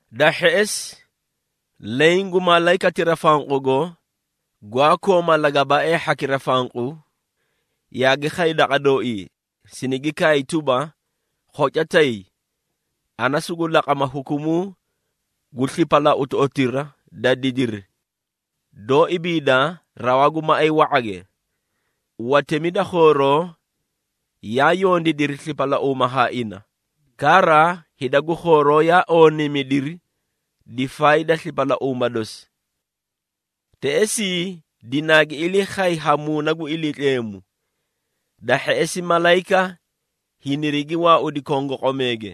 Da hheꞌesi, leẽ gu malayikatira fanqugo, gwaa kooma lagabaaee hhakira fanqu, yaagi khay daqa dooii sinigi kaay tuba, “Khoca tay, ana sugu laqama hukumuu gu slipalautoꞌotira da didiri doó ibiida rawaa gu maꞌay wa⁄age. Watemi da khooroo yaa yondiidiri slipalauuma haa ina, kara hida gu khooroo yaa ooniimidiri difaay da slipalauuma dosi.” Teꞌesii, dinaagi ilii khay ha Muuna gu Iliitleemu, da hheꞌesi malayika hinirigi waaudi kongoqomeege.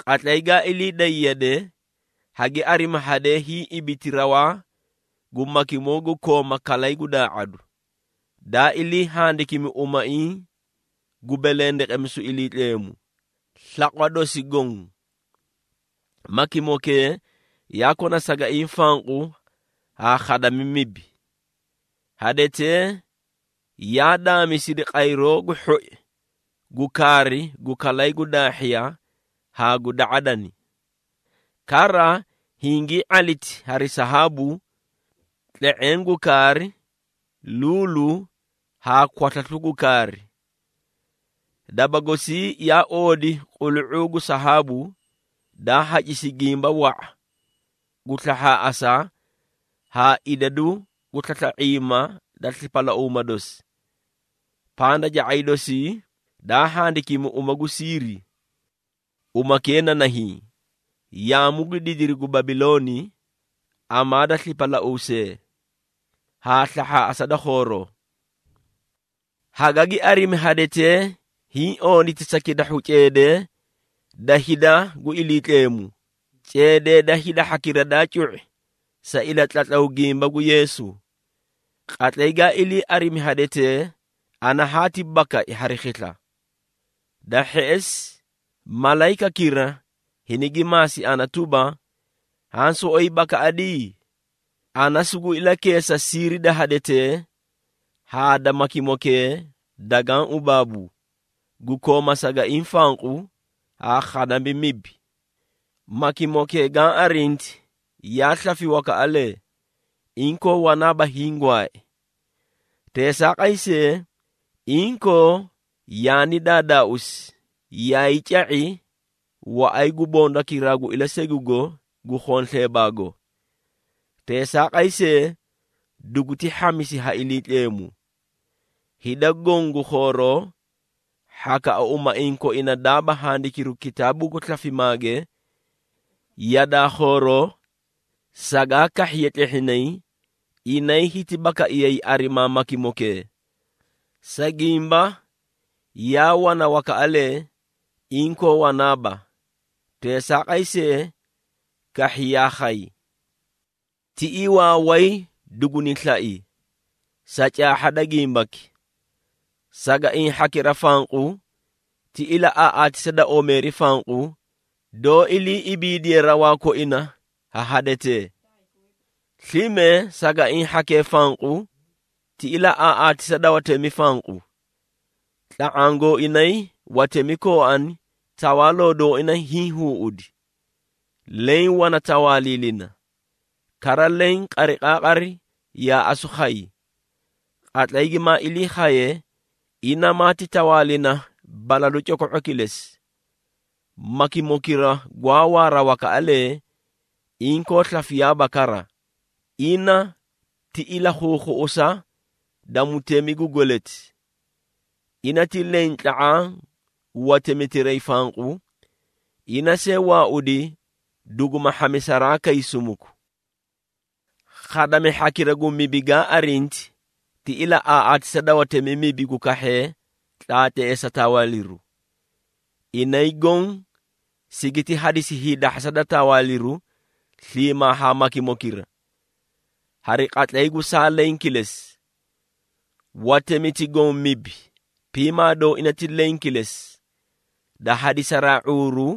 Qatlay gaa ilii day yede, hagi arimi hadee hiĩ ibiti rawaa gu makimoo gu kooma kalay gu daa⁄adu, daa ilii handikiikimi umaiĩ gu belendeqemisu Iliitleemu, slaqwa dosi goõ. Makimokee yaa kona sagaiĩ fanqu haa khadami mibi. Hadetee yaa daamisidi qayroo gu hhoi gu kaari gu kalay gu daahhiya haa gu da⁄adani. Kara, hingii ⁄aliti hari sahaabu, tle⁄eẽ gu kaari, luulu haa kwaslaslu gu kaari. Daba gosii yaa oodi qulu⁄uu gu sahaabu, daa hacisi gimba wa⁄a gu slahhaaꞌasa haa idadu gu slasla⁄iima da slipalauuma dosi. Pandaca⁄ay dosii daa handikimi uma gu siiri. Umakee na nahiĩ, “Yaamu gu Didiri gu Babilooni, Amaa da Slipalauusee, haa Slahhaaꞌasa da Khooroo.” Hagagi arimi hadetee hiĩ ooniti sa kitahhu ceedee da hida gu Iliitleemu, ceedee da hida hhakira daa cu⁄i sa ilatlatlaw gimba gu Yeesu. Qatlay gaa ilii arimi hadetee, ana haati bakai hari khisla. Da hheꞌesi, malayikakira hinigi maasi ana tuba, “Haã soꞌoyi bakaꞌadi? Ana sugu ilakeesa siiri da hadetee haa da makimokee dagaã ubaabu, gu kooma sagaiĩ fanqu haa khadami mibi. Makimokee gaã arinti yaa slafi wakaꞌalee, inkoo wanaaba hiĩ gwaai. Teesaaqay see, inkoo yaani daadaauusi yaay ca⁄i waꞌay gu bondakiraa gu ilasegugo gu khonsleebaago. Teesaaqay see, duguti hhamisi ha Iliitleemu. Hida goõ gu khooroo, hhakaꞌa umaiĩ koina daaba handikiru kitaabuu gu slafimaage, yadaa khooroo sagaa kahhiye tlehhinay, inay hiti bakaiyayi arimaa makimokee, sa gimba, yaa wana wakaꞌalee, inkoo wanaaba, teesaaqay see, kahhi yaa khayi. Tiꞌii waaway duguni slai, sa caahha da gimbaki. Sagaiĩ hhakira fanqu ti ilaꞌaaꞌatisa da omeeri fanqu, doó ilii ibiidiye rawaa koina ha hadetee. Slime sagaiĩ hhakee fanqu ti ilaꞌaaꞌatisa da watemi fanqu, tla⁄aã gooinay watemi kooani tawaaloo dooina hiĩ huuꞌudi, leẽ wana tawaaliilina, kara leẽ qariqaaqari yaa asu khayi. Qatlay gimaa ilii khaye, ina maati tawaalina balalu coko⁄o kilesi. Makimokira gwaa waara wakaꞌalee, inkoo slafiyaaba kara, ina ti ilakhuukhuꞌusa da mutemi gu gweleti. Ina ti leẽ tla⁄aã gu watemitiray fanqu, ina see waaudi duguma hhamisaraa kay sumuku. Khadami hhakira gu mibi gaa arinti, ti ilaꞌaaꞌatisa da watemi mibi gu kahhee tlaatleesa tawaaliru. Inay goõ sigiti hadisi hiidahhasa da tawaaliru sliimaa haa makimokira, hari qatlay gu saa leẽ kilesi. Watemiti goõ mibi, piimaa dooina ti leẽ kilesi, da hadisaraa ⁄uuru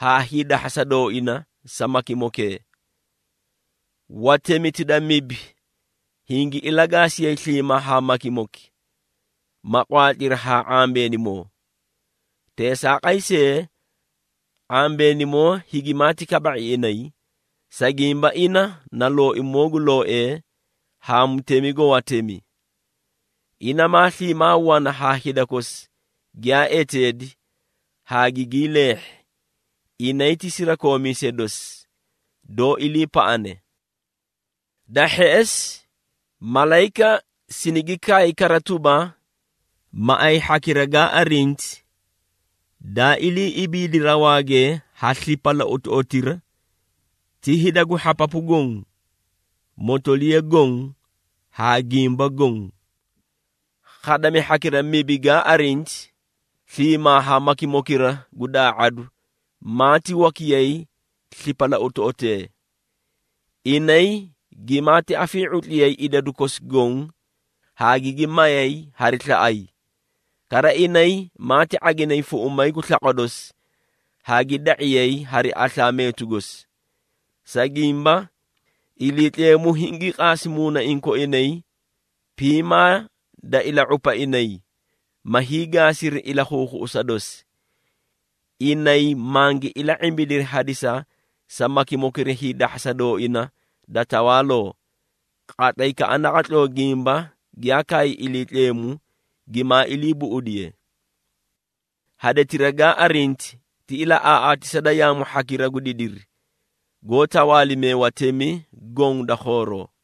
haa hiidahhasa dooina, sa makimokee. Watemiti da mibi hingi ilagaasiyay sliimaa haa makimoki, ma qwaatliri haa ⁄ambeenimoo. Teesaaqay see, ⁄ambeenimoo higimati kaba⁄i inay, sa gimba ina na Looimoo gu looee haa Mutemi gu watemi. Ina maa sliimaa wana haa hida kosi giyaa eteedi haa gigii leehhi, inay ti sirakoomiisee dosi, doó iliipaꞌane.” Da hheꞌesi, malayika sinigi kaay kara tuba, “Maꞌay hhakira gaa arinti, daa ilii ibiidi rawaage ha slipalautoꞌotira, ti hida gu hhapapu goõ, motoliya goõ haa gimba goõ. Khadami hhakira mibi gaa arinti, sliimaa haa makimokira gu daa⁄adu maati wakiyay slipalautoꞌotee. Inay gimaati afii⁄utliyay idadu kosi goõ haa gigi mayay hari slaꞌay. Kara inay maati ⁄aginay fuꞌumay gu slaqwa dosi haa gi da⁄iyay hari aslaa meetu gosi. Sa gimba, Iliitleemu hingii qaasi muunaiĩ koina piimaa da ila⁄upa inay ma hiigaasiri ilakhuukhuꞌusa dosi. Inay mangi ila⁄imbidiri hadisa sa makimokira hiidahhasa dooina da tawaaloo, qatlaykaꞌa naqatloo gimba giyaa kaay Iliitleemu gimaa ilii buꞌudiye. Hadetira gaa arinti ti ilaꞌaaꞌatisa da yaamu hhakira gu didiri, goó tawaalimee watemi goõ da khooroo.”